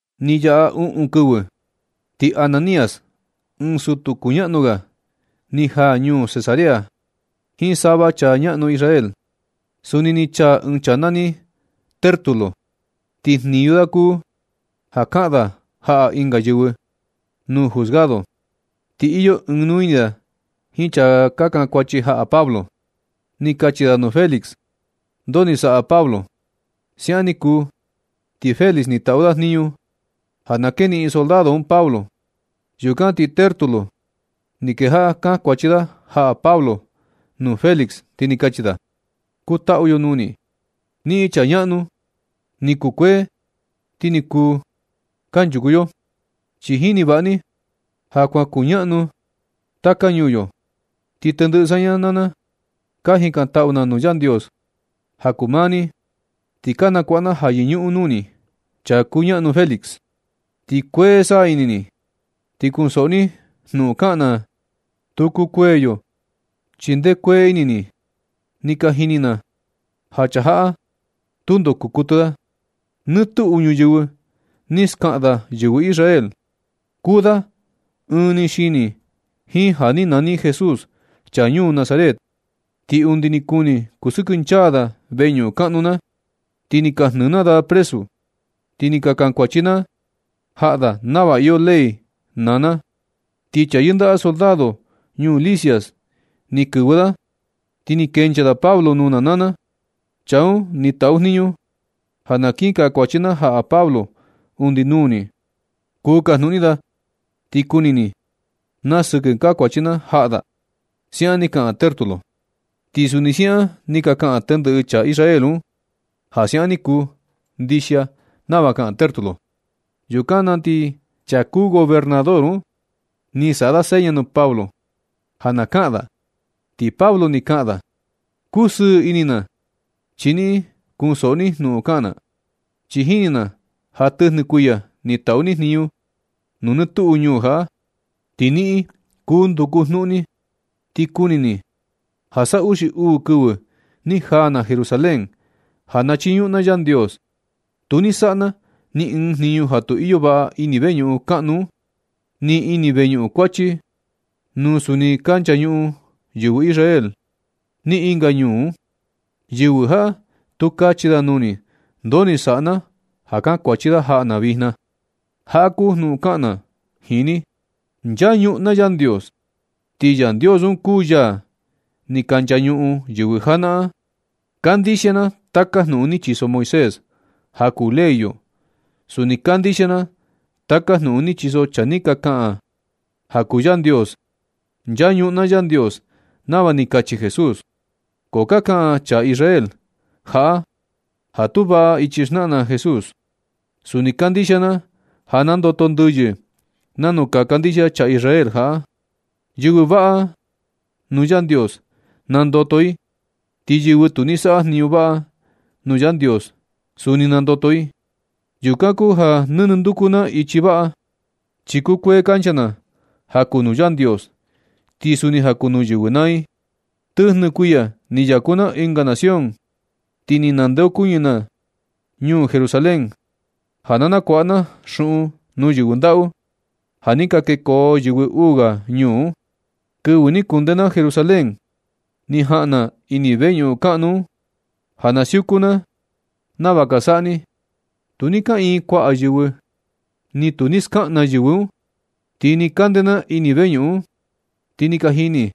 Ni yaꞌa uꞌun kɨvɨ, ti Ananías, ɨɨn sutu kuñaꞌnu ga, ni jaa ñuu Cesarea jiin sava chaa ñaꞌnu Israel. Suni ni chaa ɨɨn chaa nani Tértulo, ti jniñu da kuu ja kaꞌan da jaꞌa ɨnga yɨvɨ nuu juzgado, ti iyo ɨɨn nuu ini da jiin chaa ka kankuachi jaꞌa Pablo. Ni kachi da nuu Félix ndoo ni saꞌa Pablo. Siaꞌan ni kuu, ti Félix ni taꞌu da jniñu ja na keniꞌin soldado un Pablo. Yukan ti Tértulo, ni kejaꞌa kankuachi da jaꞌa Pablo nuu Félix, ti ni kachi da: ―Kutaꞌu yo nuu ni, niꞌin chaa ñaꞌnu, ni kukuee ti ni kuu kanchuku yo. Chi jini vaꞌa ni ja kuan kuñaꞌnu taka ñuu yo. Ti tendɨꞌɨ saña naa na ka jikantaꞌu na nuu Yandios ja kuu maa ni, ti ka nakuaꞌa na ja yɨñuꞌun nuu ni, chaa kuñaꞌnu Félix. Ti kuee saꞌa ini ni, ti kunsoꞌo ni jnuꞌun kaꞌan na, tu kukuee yo, chi ndee kuee ini ni. Ni ka jini na ja chaa jaꞌa tundo kuu kuɨtɨ da. Nɨ tuꞌu ñuyɨvɨ ni skaꞌan da yɨvɨ Israel. Kuu da ɨɨn ni xini jiin ja ni nani Jesús, chaa ñuu Nazaret. Ti undi ni kuni kusɨkɨnchaa da veñuꞌun kaꞌnu na, ti ni ka jnɨɨ na da presu, ti ni ka kankuachi na jaꞌa da nava iyo ley na naa na. Ti chaa yɨndaꞌa soldado ñuu Lisias ni kɨvɨ da, ti ni kenchaa da Pablo nuu na naa na. Chaa un ni taꞌu jniñu ja na kii kankuachi na jaꞌa Pablo undi nuu ni. Kuu kajnuꞌun ni da, ti kuni ni na sɨkɨ kankuachi na jaꞌa da ―siaꞌan ni kaꞌan Tértulo. Ti suni siaꞌan ni ka kaꞌan tendɨꞌɨ chaa Israel un ja siaꞌan ni kuu ndixia nava kaꞌan Tértulo. Yukan na ti chaa kuu gobernador un, ni saꞌa da seña nuu Pablo ja na kaꞌan da, ti Pablo ni kaꞌan da: ―Kusɨɨ ini na, chi niꞌin kunsoꞌo ni jnuꞌun kaꞌan na, chi jini na ja tɨjnɨ kuiya ni taꞌu ni jniñu nuu nɨ tuꞌu ñuu jaꞌa. Ti niꞌin kuu nduku jnuꞌun ni, ti kuni ni ja sa uxi uu kɨvɨ ni jaa na Jerusalén, ja na chiñuꞌun na Yandios. Tu ni saꞌa na ni ɨɨn jniñu ja tu iyo vaꞌa ini veñuꞌun kaꞌnu un, ni ini veñuꞌun kuachi, nuu suni ni ka nchañuꞌun yɨvɨ Israel, ni ɨnga ñuu un. Yɨvɨ jaꞌa tu kachi da nuu ni nu ndoo ni saꞌa na ja kankuachi da jaꞌa na vijna. Jaꞌa kuu jnuꞌun kaꞌan na jiin ni. Nchañuꞌun na Yandios. Ti Yandios un kuu yaa ni ka nchañuꞌun yɨvɨ janaꞌan. Kandixia na taka jnuꞌun ni chiso Moisés ja kuu ley yo. Suni kandixia na taka jnuꞌun ni chiso chaa ni ka kaꞌan ja kuu Yandios. Nchañuꞌun na Yandios nava ni kachi Jesús, ko ka kaꞌan chaa Israel jaꞌa ja tu vaꞌa ichi ni xnaꞌan Jesús. Suni kandixia na ja nandoto ndɨyɨ nanu ka kandixia chaa Israel jaꞌa. Yɨvɨ vaꞌa nuu Yandios, nandoto i ti yɨvɨ tu ni ni saꞌa jniñu vaꞌa nuu Yandios, suni nandoto i. Yukan kuu ja nɨnɨ nduku na ichi vaꞌa, chi kukuee kancha na ja kuu nuu Yandios, ti suni ja kuu nuu yɨvɨ naa i. Tɨjnɨ kuiya ni yaku na ɨnga nación, ti ni nandeokuñɨ na ñuu Jerusalén ja na nakuaꞌa na xuꞌun nuu yɨvɨ ndaꞌu, ja ni ka kekoo yɨvɨ uu ga ñuu un. Kɨvɨ ni kunde na Jerusalén, ni jaꞌan na ini veñuꞌun kaꞌnu un, ja na siuku na nava ka saꞌa ni. Tu ni kaꞌiin kuaꞌa yɨvɨ, ni tu ni skaꞌan na yɨvɨ un. Ti nɨ kande na ini veñuꞌun un, ti ni ka jini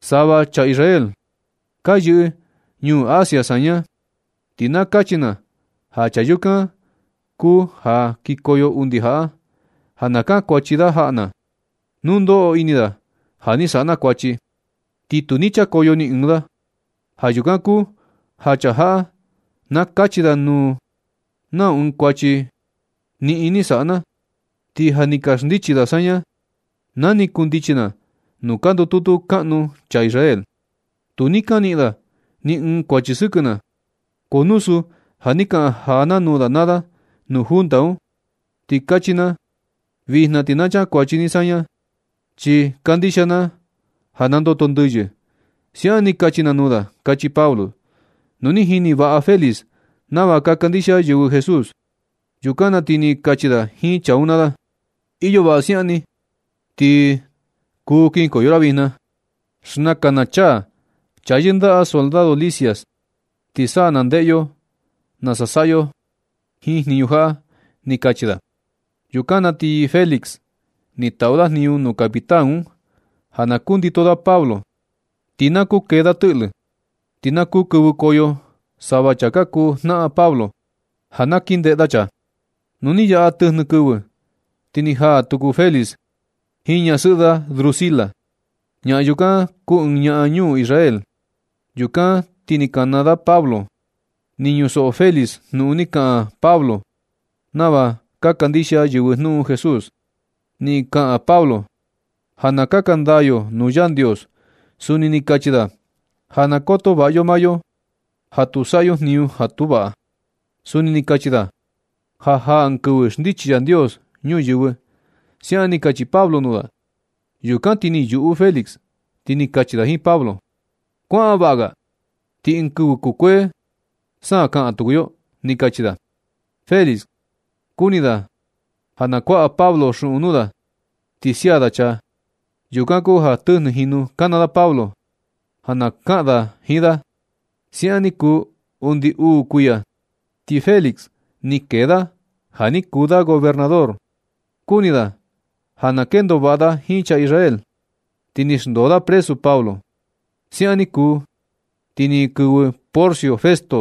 sava chaa Israel ka yɨꞌɨ ñuu Asia saña. Ti na kachi na ja chaa yukan kuu ja kikoyo undi jaꞌa, ja na kankuachi da jaꞌa na, nu ndoꞌo ini da ja ni saꞌa na kuachi. Ti tu ni chakoyo ni ɨɨn da. Ja yukan kuu ja chaa jaꞌa na kachi da nuu nau ɨɨn kuachi niꞌin ni saꞌa na, ti ja ni ka xndichi da saña na ni kundichi na nuu ka ndututu kaꞌnu chaa Israel. Tu ni ka niꞌin da ni ɨɨn kuachi sɨkɨ na, ko nu suu ja ni kaꞌan jaa na nuu da naa da nu junta un, ti kachi na: “Vijna ti ka chakuachi ni saña, chi kandixia na ja nandoto ndɨyɨ.” Siaꞌan ni kachi na nuu da ―kachi Pablo. Nu ni jini vaꞌa Félix nava ka kandixia yɨvɨ Jesús. Yukan na ti ni kachi da jiin chaa un naa da: ―Iyo vaꞌa siaꞌan ni, ti kuu kinkoyo ra vijna. Xnakan na chaa yɨndaꞌa soldado Lisias, ti sa na ndeꞌe yo nasa saꞌa yo jiin jniñu jaꞌa ―ni kachi da. Yukan na ti Félix, ni taꞌu da jniñu nuu capitán un ja na kundito da Pablo, ti na kuu kee da tɨꞌlɨ, ti na kuu kɨvɨkoyo sava chaa ka kuu jnaꞌan Pablo, ja na kin ndeꞌe da chaa. Nu ni yaꞌa tɨjnɨ kɨvɨ, ti ni jaa tuku Félix jiin ñasɨꞌɨ da Drusila. Ñaꞌan yukan kuu ɨɨn ñaa ñuu Israel. Yukan ti ni kana da Pablo. Ni ñusoꞌo Félix jnuꞌun ni kaꞌan Pablo nava ka kandixia yɨvɨ jnuꞌun Jesús. Ni kaꞌan Pablo ja na kaka ndaa yo nuu Yandios. Suni ni kachi da ja na koto vaꞌa yo maa yo ja tu saꞌa yo jniñu ja tu vaꞌa. Suni ni kachi da ja jaa ɨɨn kɨvɨ xndichi Yandios ñuyɨvɨ. Siaꞌan ni kachi Pablo nuu da. Yukan na ti ni yuꞌu Félix, ti ni kachi da jiin Pablo: ―Kuaꞌan vaꞌa ga, ti ɨɨn kɨvɨ kukuee sa na kaꞌan tuku yo ―ni kachi da. Félix kuni da ja na kuaꞌa Pablo xuꞌun nuu da ti sia da chaa. Yukan kuu ja tɨjnɨ jinu kana da Pablo ja na kaꞌan da jiin da. Siaꞌan ni kuu undi uu kuiya, ti Félix ni kee da ja ni kuu da gobernador. Kuni da ja na kendo vaꞌa da jiin chaa Israel, ti ni xndoo da presu Pablo. Siaꞌan ni kuu, ti ni kɨvɨ Porcio Festo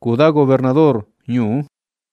kuu da gobernador ñuu un.